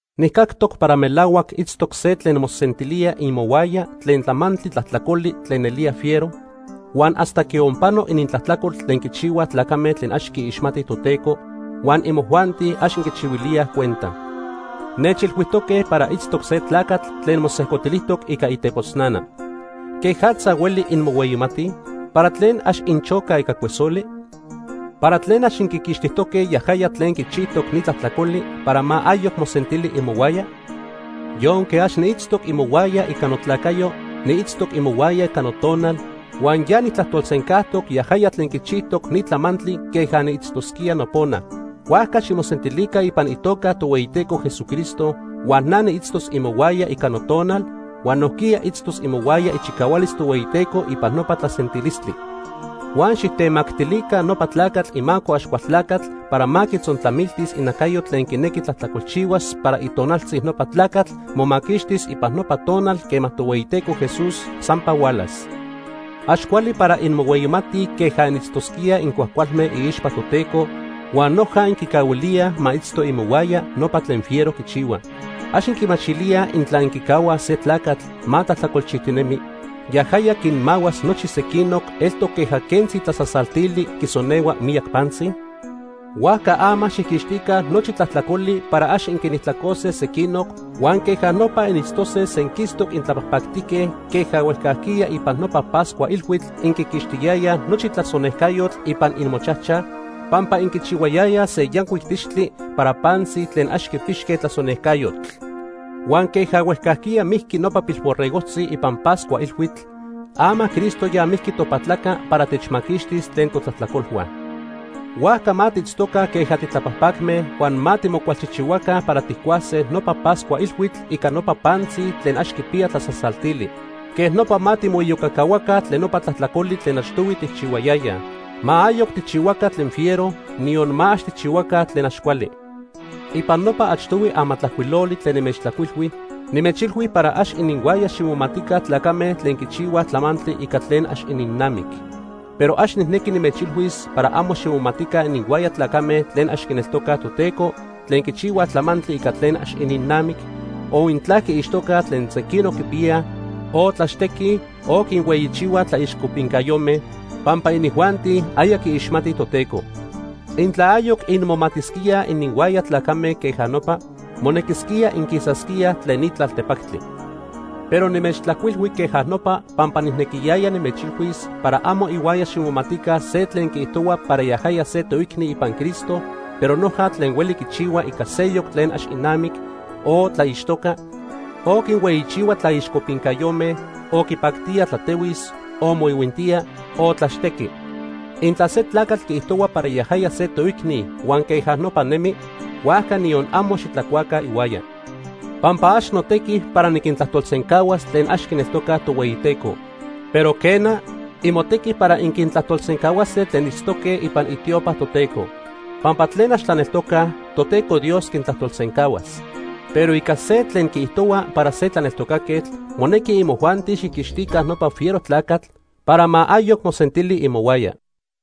Nijcactoc para melahuac itztoc se tlen mosentilía imohuaya tlen tlamantli tlajtlacoli tlen nelía fiero, huan hasta quionpano inintlajtlacol tlen quichihuaj tlacame tlen ax quiixmatij Toteco huan imojuanti ax inquichihuilíaj cuenta. Nechilhuijtoque para itztoc se tlacatl tlen mosejcotilijtoc ica itepotznana. ¿Quejatza hueli inmohueyimatij? ¿Para tlen ax inchocaj ica cuesoli? ¿Para tlen ax inquiquixtijtoque yajaya tlen quichijtoc ni tlajtlacoli para ma ayoc mosentili imohuaya? Yonque ax niitztoc imohuaya ica notlacayo, niitztoc imohuaya ica notonal, huan ya nijtlajtolsencajtoc yajaya tlen quichijtoc ni tlamantli queja niitztosquía nopona. Huajca ximosentilica ipan itoca Tohueyiteco Jesucristo huan na niitztos imohuaya ica notonal, huan nojquiya itztos imohuaya ichicahualis Tohueyiteco ipan nopa tlasentilistli. Huan xijtemactilica nopa tlacatl imaco Axcualtlacatl para ma quitzontlamiltis inacayo tlen quinequi tlajtlacolchihuas para itonaltzi nopa tlacatl momaquixtis ipan nopa tonal quema Tohueyiteco Jesús sampa hualas. Ax cuali para inmohueyimatij queja initztosquíaj incuajcualme iixpa Toteco huan noja inquicahuilíaj ma itzto imohuaya nopa tlen fiero quichihua. ¿Ax inquimachilíaj intla inquicahuaj se tlacatl ma tlajtlacolchijtinemi, yajaya quinmahuas nochi sequinoc, eltoc queja quentzi tlasasaltili quisonehua miyac pantzi? Huajca ama xijquixtica nochi tlajtlacoli para ax inquinijtlacose sequinoc huan queja nopa initztose senquistoc intlapajpactique queja huejcajquiya ipan nopa Pascua Ilhuitl inquiquixtiyayaj nochi tlasonejcayotl ipan imochajchaj pampa inquichihuayayaj se yancuic tixtli para pantzi tlen ax quipixque tlasonejcayotl. Huan queja huejcajquiya mijqui nopa pilborregojtzi ipan Pascua Ilhuitl, ama Cristo ya mijqui topatlaca para techmaquixtis tlen totlajtlacolhua. Huajca ma tiitztoca queja titlapajpacme huan ma timocualchijchihuaca para tijcuase nopa Pascua Ilhuitl ica nopa pantzi tlen ax quipiya tlasasaltili. Quejnopa ma timoiyocacahuaca tlen nopa tlajtlacoli tlen achtohui tijchihuayayaj. Ma ayoc tijchihuaca tlen fiero, niyon ma ax tijchihuaca tlen ax cuali. Ipan nopa achtohui amatlajcuiloli tlen nimechtlajcuilhui, nimechilhui para ax ininhuaya ximomatica tlacame tlen quichihuaj tlamantli ica tlen ax ininnamic. Pero ax nijnequi nimechilhuis para amo ximomatica ininhuaya tlacame tlen ax quineltocaj Toteco tlen quichihuaj tlamantli ica tlen ax ininnamic, o intla quiixtocaj tlen sequinoc quipiyaj, o tlaxtequij, o quinhueyichihuaj tlaixcopincayome, pampa inijuanti aya quiixmatij Toteco. Intla ayoc inmomatisquíaj ininhuaya tlacame queja nopa, monequisquía inquisasquíaj tlen ni tlaltepactli. Pero nimechtlajcuilhui queja nopa pampa nijnequiyaya nimechilhuis para amo ihuaya ximomatica se tlen quiijtohua para yajaya se toicni ipan Cristo pero noja tlen hueli quichihua ica seyoc tlen ax inamic, o tlaixtoca, o quinhueyichihua tlaixcopincayome, o quipactía tlatehuis, o moihuintía, o tlaxtequi. Intla se tlacatl quiijtohua para yajaya se toicni huan queja nopa nemi, huajca niyon amo xitlacuaca ihuaya. Pampa ax notequi para niquintlajtolsencahuas tlen ax quineltocaj Tohueyiteco. Pero quena, imotequi para inquintlajtolsencahuase tlen itztoque ipan itiopa Toteco. Pampa tlen ax tlaneltocaj, Toteco Dios quintlajtolsencahuas. Pero ica se tlen quiijtohua para se tlaneltocaquetl, monequi imojuanti xijquixtica nopa fiero tlacatl para ma ayoc mosentili imohuaya.